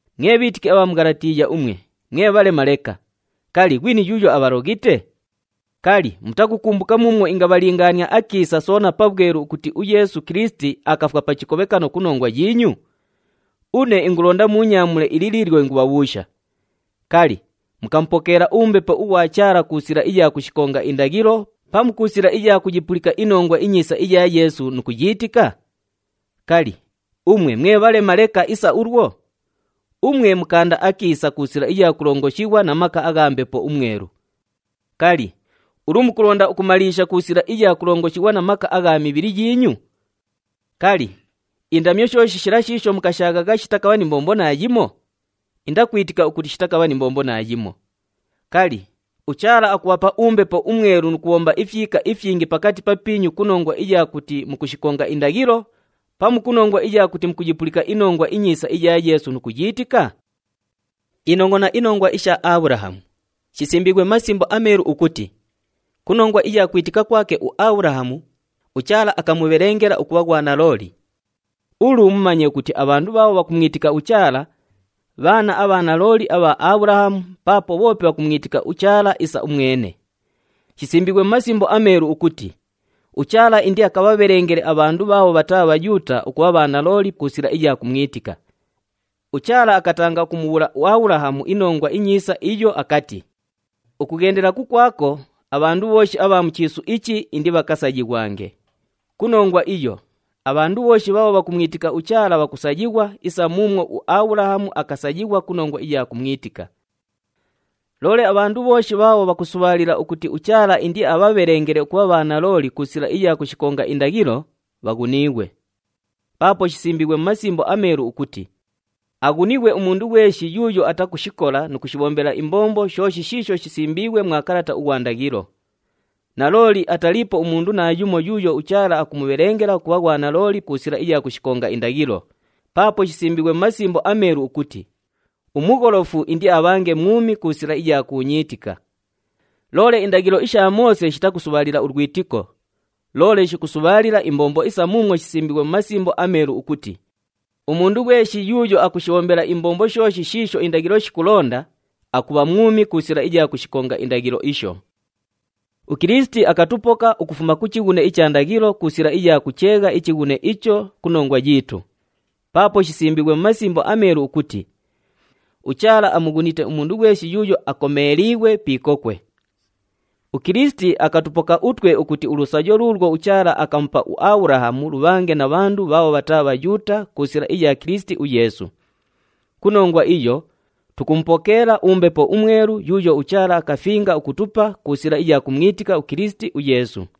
Mwe bhiitiki abha mu Ghalatiiya umwe, mwe bhalema leka! Kali, ghwini yuuyo abhaloghite? Kali, mutakukumbuka muumwo ingabhalingaania akiisa soona pabhwelu ukuti uYeesu Kilisiti akafwa pa chikobhekano ku nongwa yiinyu? Une ingulonda muunyaamule ili liilyo ingubhabhuusha, kali, mukamupokeela uMbepo ughwa Chaala ku sila iya kushikonga indaghilo pamu ku sila iya kuyipulika iNongwa iNyiisa iya Yeesu nu kuyiitika? Kali, umwe mwe bhalema leka isa ulwo? Umwe mukaanda akiisa ku sila iya kulongoshighwa na maka agha Mbepo uMwelu. Kali, ulu mukulonda ukumaliisha ku sila iya kulongoshighwa na maka agha mu mibhili yiinyu? Kali, indamyo shooshi shila shiisho mukashaaghagha shitakabha ni mbombo naayimo? Indakwitika ukuti shitakabha ni mbombo naayimo! Kali, uChaala akubhapa uMbepo uMwelu nu kubhomba ifyika ifyingi pakati papiinyu ku nongwa iya kuti mukushikonga indaghilo, pamu ku nongwa iya kuti mukuyipulika iNongwa iNyiisa iya Yeesu nu kuyiitika? Inongʼona inongwa isha Abhulahamu. Shisimbiighwe mu Masimbo aMeelu ukuti, “Ku nongwa iya kwitika kwake uAbhulahamu, uChaala akamubhelengela ukubha ghwanalooli.” Ulu mumanye ukuti abhandu bhaabho bhakumwitika uChaala, bhaana abha nalooli abha Abhulahamu paapo bhoope bhakumwitika uChaala isa umwene! Shisimbiighwe mu Masimbo aMeelu ukuti uChaala indiakabhabhelengele abhandu bhaabho bhataa Bhayuuta ukubha bhanalooli ku sila iya kumwitika. UChaala akatanga ukumubhuula uAbhulahamu iNongwa iNyiisa iyo akati, “Ukughendela kukwako, abhandu bhooshi abha mu chiisu ichi indibhakasayighwange.” Ku nongwa iyo, abhandu bhooshi bhaabho bhakumwitika uChaala bhakusayighwa isa muumwo uAbhulahamu akasayighwa ku nongwa iya kumwitika. Loole abhandu bhooshi bhaabho bhakusubhaalila ukuti uChaala indiabhabhelengele ukubha bhanalooli ku sila iya kushikonga indaghilo, bhaghuniighwe. Paapo shisimbiighwe mu Masimbo aMeelu ukuti, “Aghunighwe umundu ghweshi yuuyo atakushikola nu kushibhombela imbombo shooshi shiisho shisimbiighwe mwa kalata ughwa ndaghilo.” Nalooli ataliipo umundu naayumo yuuyo uChaala akumubhelengela ukubha ghwanalooli ku sila iya kushikonga indaghilo, paapo shisimbiighwe mu Masimbo aMeelu ukuti, “Umugholofu indiabhange mwumi ku sila iya kuunyiitika.” Loole indaghilo isha Moose shitakusubhaalila ulwitiko, loole shikusubhaalila imbombo isa muumwo shisimbiighwe mu Masimbo aMeelu ukuti, “Umundu ghweshi yuuyo akushikonga indaghilo, akubha mwumi ku sila iya indaghilo isho.” UKilisiti akatupoka ukufuma ku chighune icha ndaghilo ku sila iya kucheegha ichighune icho ku nongwa yiitu, paapo shisimbiighwe mu Masimbo aMeelu ukuti, “UChaala amughunite umundu ghweshi yuuyo akomeeliighwe pi ikokwe.” UKilisiti akatupoka utwe ukuti ulusayo luulwo uChaala akamupa uAbhulahamu lubhaaghe na bhandu bhaabho bhataa Bhayuuta ku sila iya Kilisiti uYeesu. Ku nongwa iyo, tukumupokeela uMbepo uMwelu yuuyo uChaala akafinga ukutupa ku sila iya kumwitika uKilisiti uYeesu.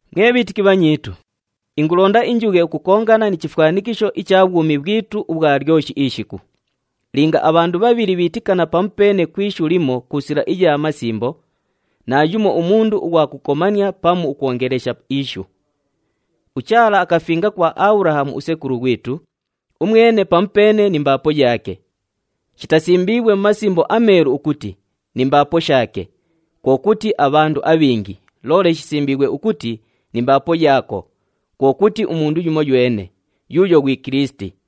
Mwe bhiitiki bhanyiitu, ingulonda injughe ukukongana ni chifwanikisho icha bhwumi bhwitu ubhwa lyoshi ishiku. Linga abhandu bhabhili bhiitikana pamupeene ku ishu limo ku sila iya masimbo, naayumo umundu ughwa kukomania pamu ukwongelesha ishu. UChaala akafinga kwa Abhulahamu usekulu ghwitu, umwene pamupeene ni mbaapo yaake. Shitasimbiighwe mu Masimbo aMeelu ukuti, “Ni mbaapo shaake,” kwo kuti abhandu abhingi, loole shisimbiighwe ukuti, “Ni mbaapo yaako,” kwo kuti umundu yumoywene, yuuyo ghwi Kilisiti.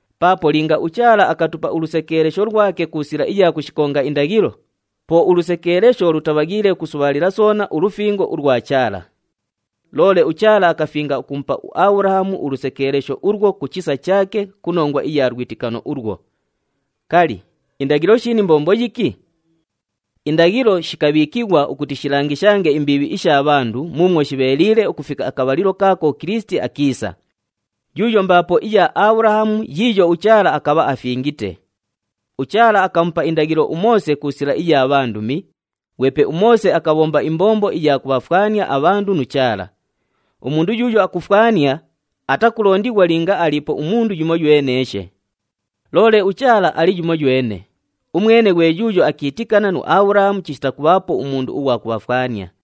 Paapo linga uChaala akatupa ulusekeelesho lwake ku sila iya kushikonga indaghilo, po ulusekeelesho lutabhaghiile ukusubhaalila soona ulufingo ulwa Chaala. Loole uChaala akafinga ukumupa uAbhulahamu ulusekeelesho ulwo ku chisa chaake ku nongwa iya lwitikano ulwo. Kali, indaghilo shili ni mbombo yiki? Indaghilo shikabhiikighwa ukuti shilangishange imbiibhi isha bhandu muumwo shibheeliile ukufika akabhalilo kaako uKilisiti akiisa, yuuyo mbaapo iya Abhulahamu yiiyo uChaala akabha afingite. UChaala akamupa indaghilo uMoose ku sila iya bhandumi, ghwepe uMoose akabhomba imbombo iya kubhafwania abhandu nu Chaala. Umundu yuuyo akufwania, atakulondighwa linga aliipo umundu yumoyweneeshe. Loole uChaala ali yumoywene, umwene ghwe yuuyo akiitikana nu Abhulahamu chishita kubhaapo umundu ughwa kubhafwania.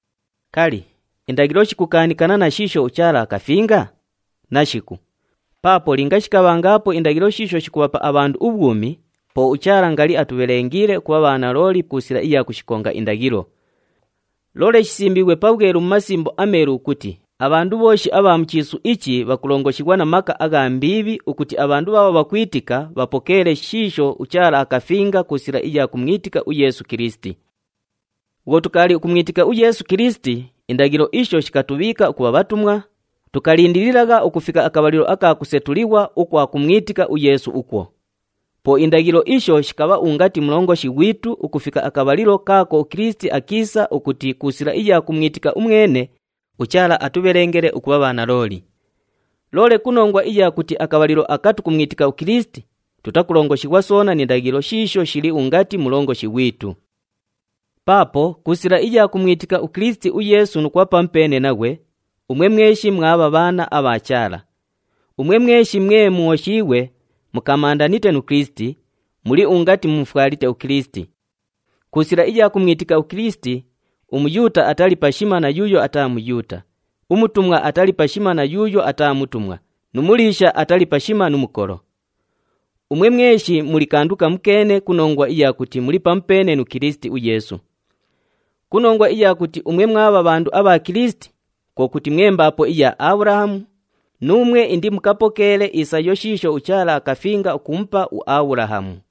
Kali, indaghilo shikukaanikana na shiisho uChaala akafinga? Nashiku! Paapo linga shikabhangaapo indaghilo shiisho shikubhapa abhandu ubhwumi, po uChaala ngali atubhelengiile ukubha bhanalooli ku sila iya kushikonga indaghilo. Loole shisimbiighwe pabhwelu mu Masimbo aMeelu ukuti abhandu bhooshi abha mu chiisu ichi bhakulongoshighwa na maka agha mbiibhi ukuti abhandu bhaabho bhakwitika, bhapokeele shiisho uChaala akafinga ku sila iya kumwitika uYeesu Kilisiti. Bhwo tukaali ukumwitika uYeesu Kilisiti, indaghilo isho shikatubhiika ukubha bhatumwa, tukalindililagha ukufika akabhalilo aka kusetulighwa ukwa kumwitika uYeesu ukwo. Po indaghilo isho shikabha ungati mulongoshi ghwitu ukufika akabhalilo kaako uKilisiti akiisa ukuti ku sila iya kumwitika umwene, uChaala atubhelengele ukubha bhanalooli. Loole ku nongwa iya kuti akabhalilo aka tukumwitika uKilisiti, tutakulongoshighwa soona ni ndaghilo shiisho shili ungati mulongoshi ghwitu. Paapo ku sila iya kumwitika uKilisiti uYeesu nu kubha pamupeene naghwe, umwe mweshi mwabha bhaana abha Chaala. Umwe mweshi mwe mwoshiighwe, mukamandanite nu Kilisiti, muli ungati mumufwalite uKilisiti. Ku sila iya kumwitika uKilisiti, uMuyuuta atali pashima na yuuyo ataa Muyuuta, umutumwa atali pashima na yuuyo ataa mutumwa nu muliisha atali pashima nu mukolo. Umwe mweshi muli kandu kamukeene ku nongwa iya kuti muli pamupeene nu Kilisiti uYeesu. Ku nongwa iya kuti umwe mwabha bhandu abha Kilisiti, kwo kuti mwe mbaapo iya Abhulahamu, nuumwe indimukapokeele isayo shiisho uChaala akafinga ukumupa uAbhulahamu.